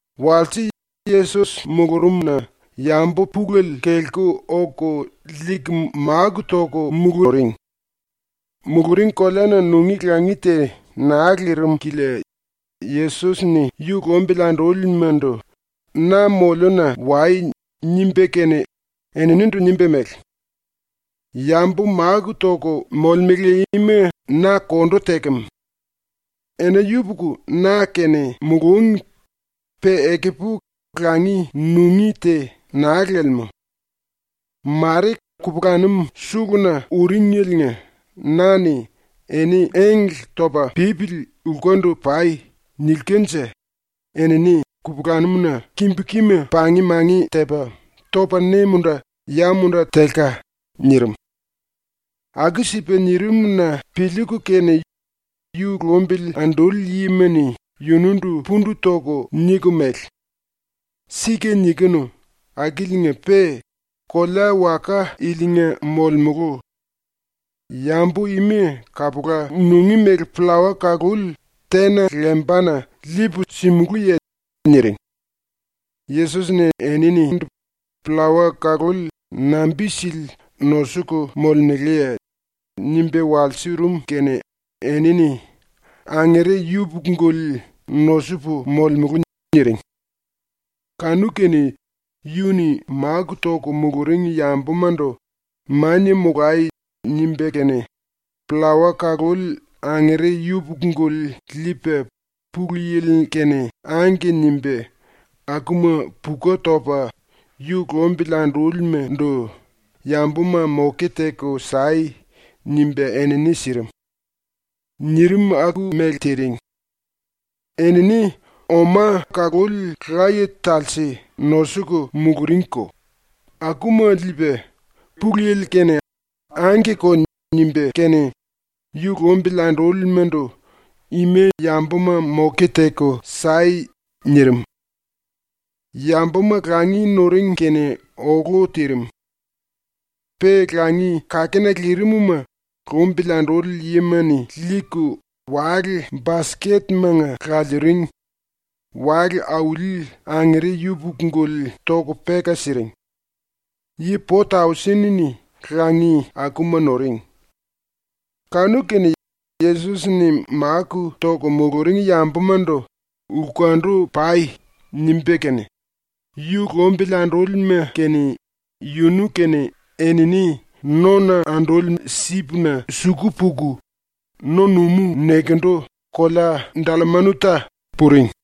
Walse ⸤Yesos mulurumna⸥ yambu pulele kelku oku liiku máku toku muluring. Muluring koleana nungí langi te naa lirim kilia Yesos-ni yu lumbili andúlimandu “Na moliuna wai.” nimba kene eninindu nimba mele: “Yambu máku toku molemele ima na kondu tekem. Ena yupuku na-kene mulúngi, pe ekupu langi nungí te naa lelemú. Mare kupulanum suluna uringeliinga na-ni “Eni engle topa pípili lkundu pai.” nilkanje enini kupulanum-na kimbu kima pang-mangi tepa, topa ne-munda ya-munda telka.” nirim. Aku-sipa nirim-na piliiku kene yu lumbili anduli yima-ni yunundu pundu toku niku mele: “⸤Sika nikinu akiliinga-pe⸥ kolea-waka ilinga molemulu. Yambu ima kapula nungí mele pllawa kaluli tena lembana liipu simulúye?” niring. Yesos-ni eninindu “Pllawa kaluli nambi-sili nosuku molemeleye?” nimba walsurum kene enini “Angere yupuku-guli nosupu molemulu.” niring. Kanu-kene yu-ni máku toku muluring yambumandu “Mania molai.” nimba kene, pllawa kaluli angere yupuku-guli liipa ⸤Pulu Yili-kene⸥ “Angke” nimba, akuma puku topa yu lumbili andúlimandu “Yambuma moke teku sai.” nimba enini sirim. Nirim aku-mele tiring. Enini oma kaluli laye-talse nosuku muluringko, akuma liipa ⸤Pulu Yili-kene⸥ “Angkeko.” nimba kene yu lumbili andúlimandu “Ima yambuma moke teku sai.” nirim. Yambuma ⸤langi⸥ nuring kene olu tirim. Pe langi-kakena lirim-ma lumbili anduli yima-ni liiku wale-basketmanga laliiring, wale auli angere yupuku-guli toku peka siring. Yi po-tausen-ni langi akuma nuring. Kanu-kene Yesos-ni máku toku muluring yambumandu “Lkundu pai.” nimba kene, yu lumbili andúlima kene yunu kene enini nona anduli sipna suku puku, ⸤no-numú nekendu⸥ kolea Dallamanuta puring.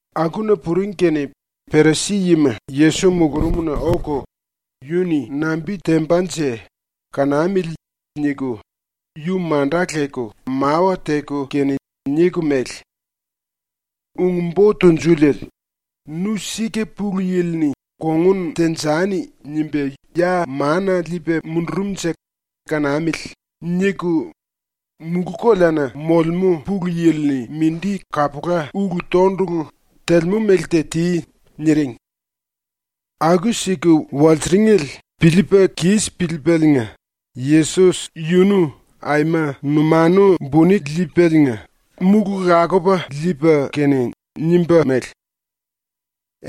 Akuna puring kene Perisi-yima Yesos mulurumna oku, ‘Yu-ni nambi tembanje? Kanamili.’ niku yu manda leku mawa teku kene niku mele: “⸤Ung-Bo Tunjuliele,⸥ ‘Nu sika Pulu Yili-ni ‘Kongun tenjani.’ nimba ya mana liipa mundurumnje kanamili.’ niku mulú-koleana molemú Pulu Yili-ni mindi kapula ulu-tondulu telemú mele te ti.” niring. ⸤Aku-siku walsiringele piliipa kis piliipaliinga Yesos⸥ yunu aima numanu buni liipaliinga múlu lakupa liipa kene nimba mele: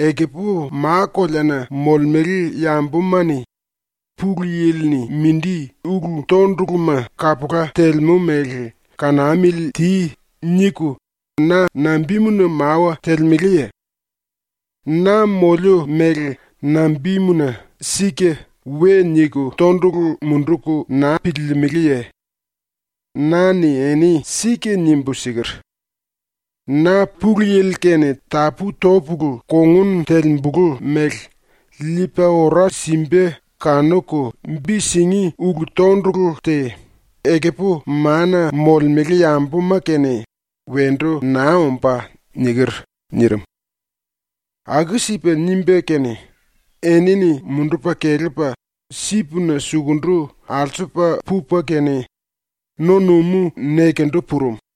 “Ekupu ma-koleana molemele yambuma-ni “Pulu Yili-ni mindi ulu-tonduluma kapula telemú mele kanamili ti.” niku na nambimuna mawa telemeleye? ⸤Na moliu mele nambimuna “Sika” we niku tondulu munduku naa piliilimiliye?⸥ Na-ni eni sika nimbu siker: “⸤Na Pulu Yili kene tapú-topulu kongun telembulu mele⸥ liipa ora simba kanuku bi singí ulu-tondulu te, ekupu mana molemele yambuma-kene wendu naa ombá.” niker.” nirim. Aku-sipa nimba kene, enini mundupa kelepa sipna sukundu alsupa pupa kene no-numú nekendu purum.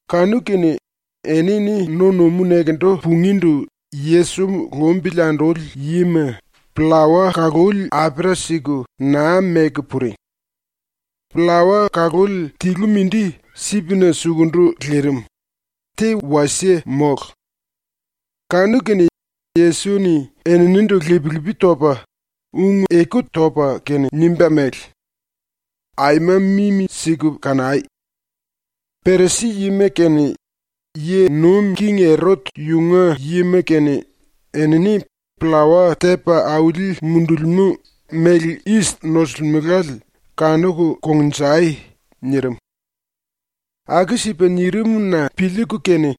⸤Kanu-kene enini no-numú nekendu pungíndu Yesos lumbili anduli yima⸥ pllawa kaluli apera siku naa meku puring. Pllawa kaluli tilu mindi sipna sukundu lirim, te wasie mólu. Kanu-kene Yesos-ni eninindu lip-lipi topa ⸤ung-eku topa kene⸥ nimba mele: “Aima mimi-siku kanai! Perisi-yima kene ⸤yi nuim king⸥ Erot yunga yima kene enini pllawa tepa auli mundulimú méle yis nosulimelale kanuku kongnjai!” nirim. Aku-sipa nirim-na piliiku kene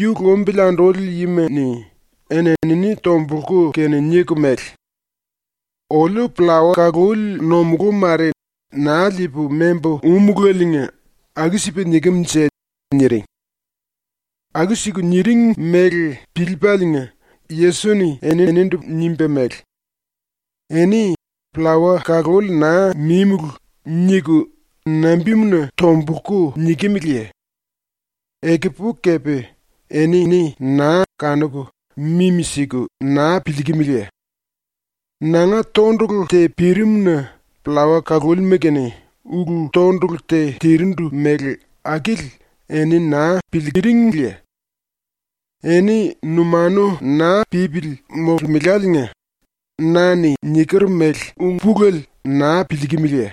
yu lumbili anduli yima-ni eni-enini tombulku kene niku mele: “Oliu pllawa kaluli ⸤nomulú⸥ mare naa liipu membu úmulaliinga aku-sipa nikem-nje.” niring. Aku-siku niring mele piliipaliinga Yesos-ni eninindu nimba mele: “Eni “Pllawa kaluli naa mímulu.” niku nambimuna tombulku nikimiliye? Ekupu kepe eni naa kanuku, mimi-siku naa piliikimiliye? ⸤Nanga tondulu te pirim-na pllawa kalulima-kene ulu-tondulu te tirindu mele akili eni naa piliiringiye?⸥ Eni numanu naa pípili molemeláliinga na-ni niker mele ung-pulele naa piliikimiliye?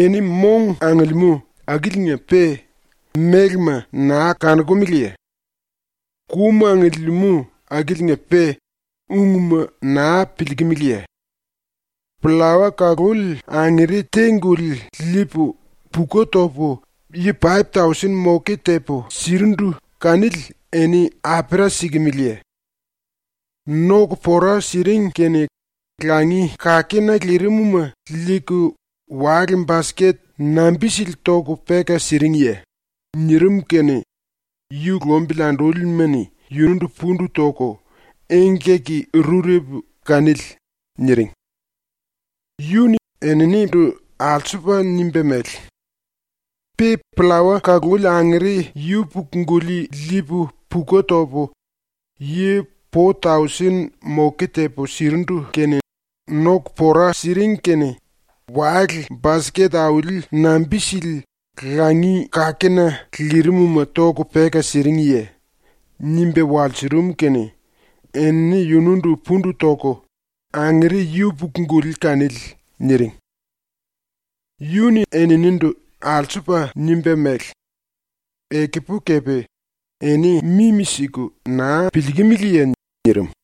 Eni mong angiliimú akiliinga-pe mélema naa kanokumeleye? Kum angiliimú akiliinga-pe ungma naa piliikimiliye? Pllawa kaluli angere te-guli liipu puku topu yi paip-tausen moke tepu sirindu kanili eni apera sikimiliye? ⸤Noku pora siring kene⸥ langi-kakena lirim-ma liiku wale-basket nambi-sili toku peka siringye?” nirim kene ⸤yu lumbili andúlima-ni⸥ yundu pundu toku “Engkaki-rurepu kanili.” niring. ⸤Yu-ni eninindu alsupa nimba mele:⸥ “Pe pllawa kaluli angere yupuku-guli liipu puku topu ⸤yi⸥ po-tausen moke tepu sirindu kene ⸤noku pora siring kene⸥ wale-basket auli nambi-sili langi-kakena lirim-ma toku peka siringye?” nimba walsurum kene enini yunundu pundu toku “Angere yupuku-guli kanili.” niring. Yu-ni eninindu ⸤alsupa⸥ nimba mele: “Ekupu kepe eni mimi-siku naa piliikimiliye?” nirim.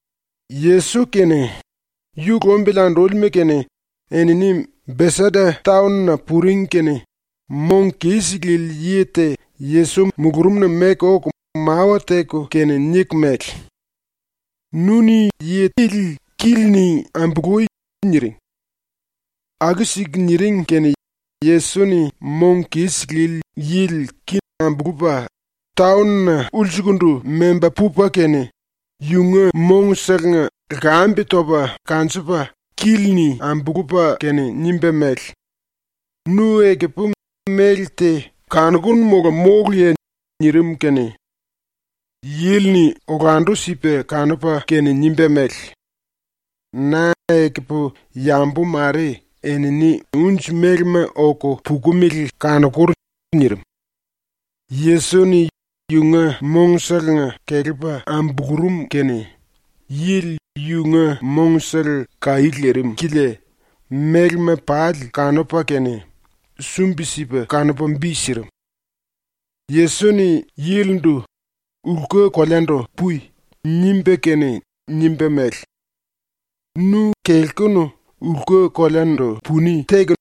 Yesos kene, yu lumbili andúlima kene, enini Besaida taon-na puring kene mong kis lili yi te Yesos mulurumna meku oku mawa teku kene niku mele: “Nu-ni yi ili kíli-ni ambului.” niring. Aku-siku niring kene Yesos-ni mong kis lili yili ki ambulupa taon-na ulsukundu memba pupa kene yunga mongselenga lkambe topa kanjupa kili-ni ambulupa kene nimba mele: “Nu ekupu méle te kanokunu mola móluye?” nirim kene yili-ni olandu-sipa kanupa kene nimba mele: “Na ekupu yambu mare, enini unji-melema oku pukumele kanokur.” nirim. Yesos-ni yunga mongselenga kelepa ambulurum kene yili yunga mongsele kaí lirim kilia mélema pali kanupa kene sumbi-sipa kanupa bi sirim. Yesos-ni yilindu “Lku-koleandu pui.” nimba kene nimba mele: “Nu kelkunu lku-koleandu puni teku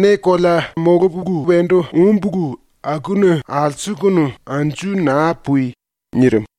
ne kolea ⸤molupu wendu úmbulu⸥ akuna alsukunu anju naa pui.” nirim.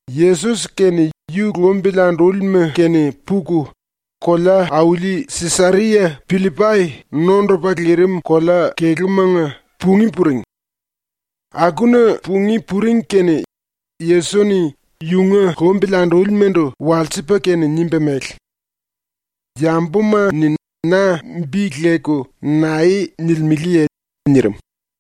Yesos kene yu lumbili andúlima kene puku kolea-auli Sisaria-Pillipai nondupa lirim kolea kelúmanga pungí puring. Akuna pungí puring kene Yesos-ni yunga lumbili andúlimandu walsipa kene nimba mele: “Yambuma-ni na bi leku nae nilimeleye?” nirim.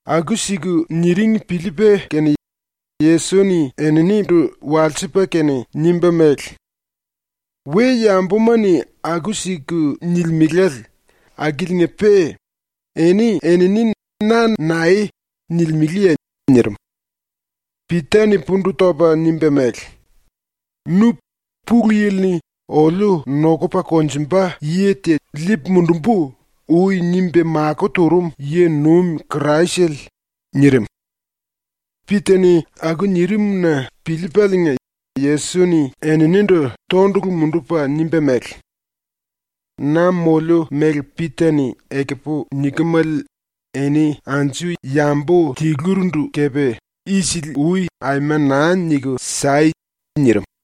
Aku-siku niring piliipa kene Yesos-ni eninindu walsipa kene nimba mele: “⸤We-yambuma-ni aku-siku nilimele⸥ akiliinga-pe eni-enini na nae nilimeleye?” nirim. Pita-ni pundu topa nimba mele: “Nu Pulu Yili-ni ‘Oliu nokupa konjumba yi te liipu mundumbu.’ ui nimba makó turum yi-nuim Kraisele.” nirim. ⸤Pita-ni aku nirim-na piliipaliinga⸥ Yesos-ni eninindu tondulu mundupa nimba mele: “Na moliu mele ⸤Pita-ni ekupu nikemele⸥ eni anju yambu tilurindu kepe ⸤isili-ui⸥ aima naa niku sai!” nirim.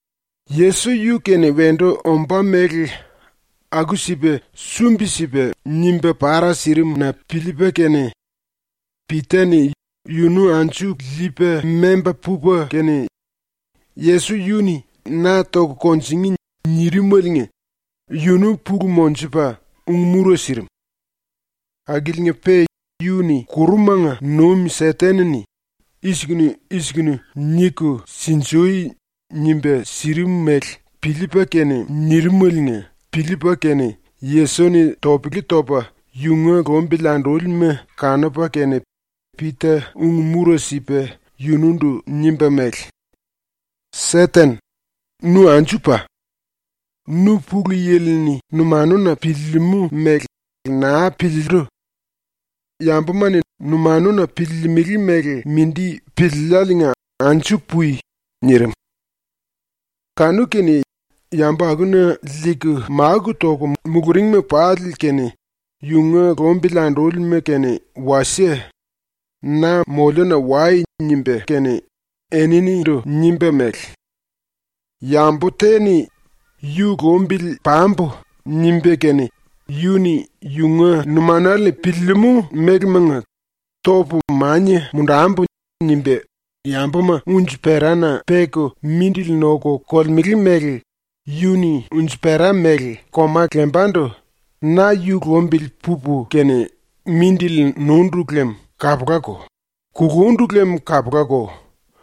Yesos yu-kene wendu ombá mele aku-sipa sumbi-sipa nimba para sirim-na piliipa kene Pita-ni yunu anju liipa memba pupa kene ⸤Yesos yu-ni “Na toku kunjingí.” nirimaliinga⸥ yunu pulu monjupa ung-mura sirim. Akiliinga-pe ⸤yu-ni kurumanga nuim Seten-ni “I-sikunu i-sikunu niku sinjui.” nimba sirim mele piliipa kene nirimeliinga piliipa kene⸥ Yesos-ni topele topa yunga lumbili andúlima kanupa kene Pita ung-mura sipa yunundu nimba mele: “Seten, nu anju pa! Nu Pulu Yili-ni numanuna piliilimú mele naa piliillu. Yambuma-ni numanuna piliilimili mele mindi piliilláliinga anju pui!” nirim. Kanu-kene yambu akuna liiku máku toku muluringma pali kene yunga lumbili andúlima kene wasie “Na moliuna wai.” nimba kene eninindu nimba mele: “Yambu te-ni ‘Yu lumbili pambu.’ nimba kene yu-ni yunga numanale-ni piliilimú mélemanga ‘Topu mania mundambu.’ nimba yambuma unji-perana peku mindili noku kolemele mele yu-ni unji-pera mele koma lembandu ‘Na yu lumbili pupu kene mindili nundu lem kapulako; kulundu lem kapulako.’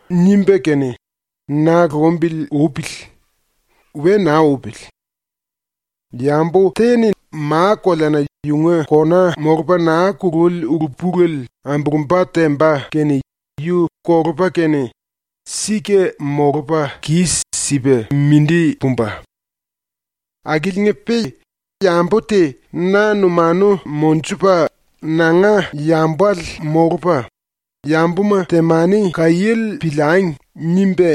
nimba kene na lumbili upili. We naa upili. Yambu te-ni ma-koleana yunga kona molupa naa kululi ulu-pulele ambulumba temba kene yu kolupa kene sika molupa kis-sipa mindi pumba. Akiliinga-pe yambu te na numanu monjupa nanga yambale molupa, ‘Yambuma temani kaiéle piliangi.’ nimba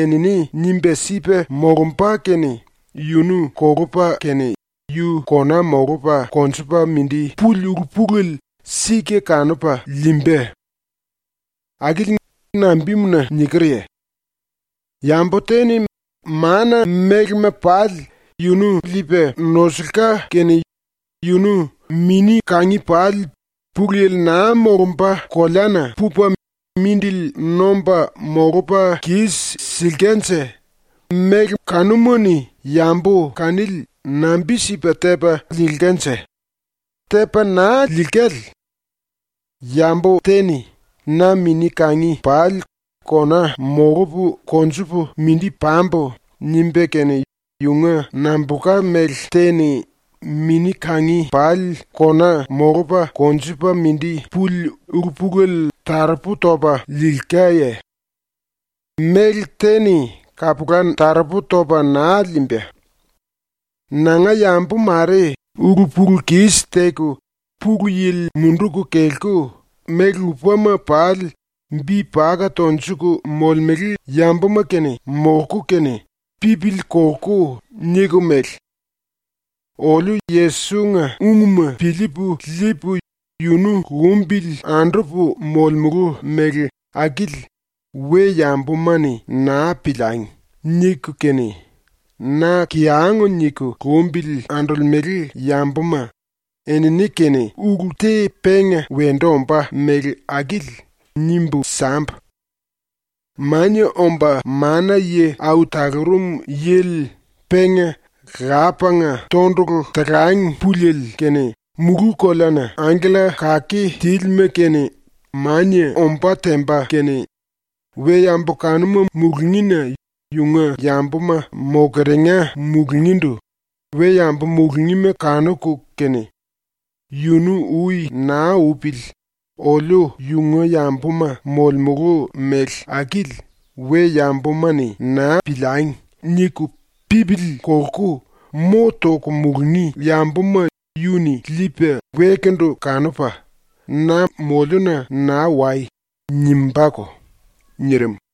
enini nimba sipa molumba kene yunu kolupa kene yu kona molupa konjupa mindi puli ulu-pulele sika kanupa liimba. ⸤Akili nambimuna nikerye?⸥ Yambu te-ni mana mélema pali yunu liipa nosulka kene yunu mini-kangi pali Pulu Yili naa molumba koleana pupa mindili nomba molupa kis-silkanje méle kanuma-ni yambu kanili nambi-sipa tepa liilkanje? Tepa naa liilkale. Yambu te-ni ‘Na mini-kangi pali kona molupu konjupu mindi pambu.’ nimba kene yunga nambulka méle te-ni mini-kangi pali kona molupa konjupa mindi puli ulu-pulele taropu topa liilkaye? Méle te-ni kapula taropu topa naa liimba. “Nanga yambu mare ulu-pulu-kis teku Pulu Yili munduku kelku méle lupama pali bi paka tonjuku molemele yambuma-kene molku kene pipili kolku niku mele: “Oliu Yesos-nga ungma piliipu liipu, yunu lumbili andupu molemulu mele akili we-yambuma-ni naa piliangi.” niku kene na kiyang niku lumbili andolemele yambuma, enini-kene ulu te penga wendu ombá mele akili nimbu sambu: Mania Omba Mana-Yi Au Talurum Yili penga Lapanga tondulu talang puliele kene ⸤mulú-koleana⸥ angkella kake tílima kene ⸤mania⸥ ombá temba kene, we-yambu kanuma mulungína yunga yambuma mokeringa mulungíndu we-yambu mulungíma kanuku kene, yunu ui naa upili ‘Oliu yunga yambuma molemulu mele akili we-yambuma-ni naa piliangi.’ niku pipili kolku mo toku mulungí yambuma yu-ni liipa wekundu kanupa, “Na moliuna naa wai.” nimbáko.” nirim.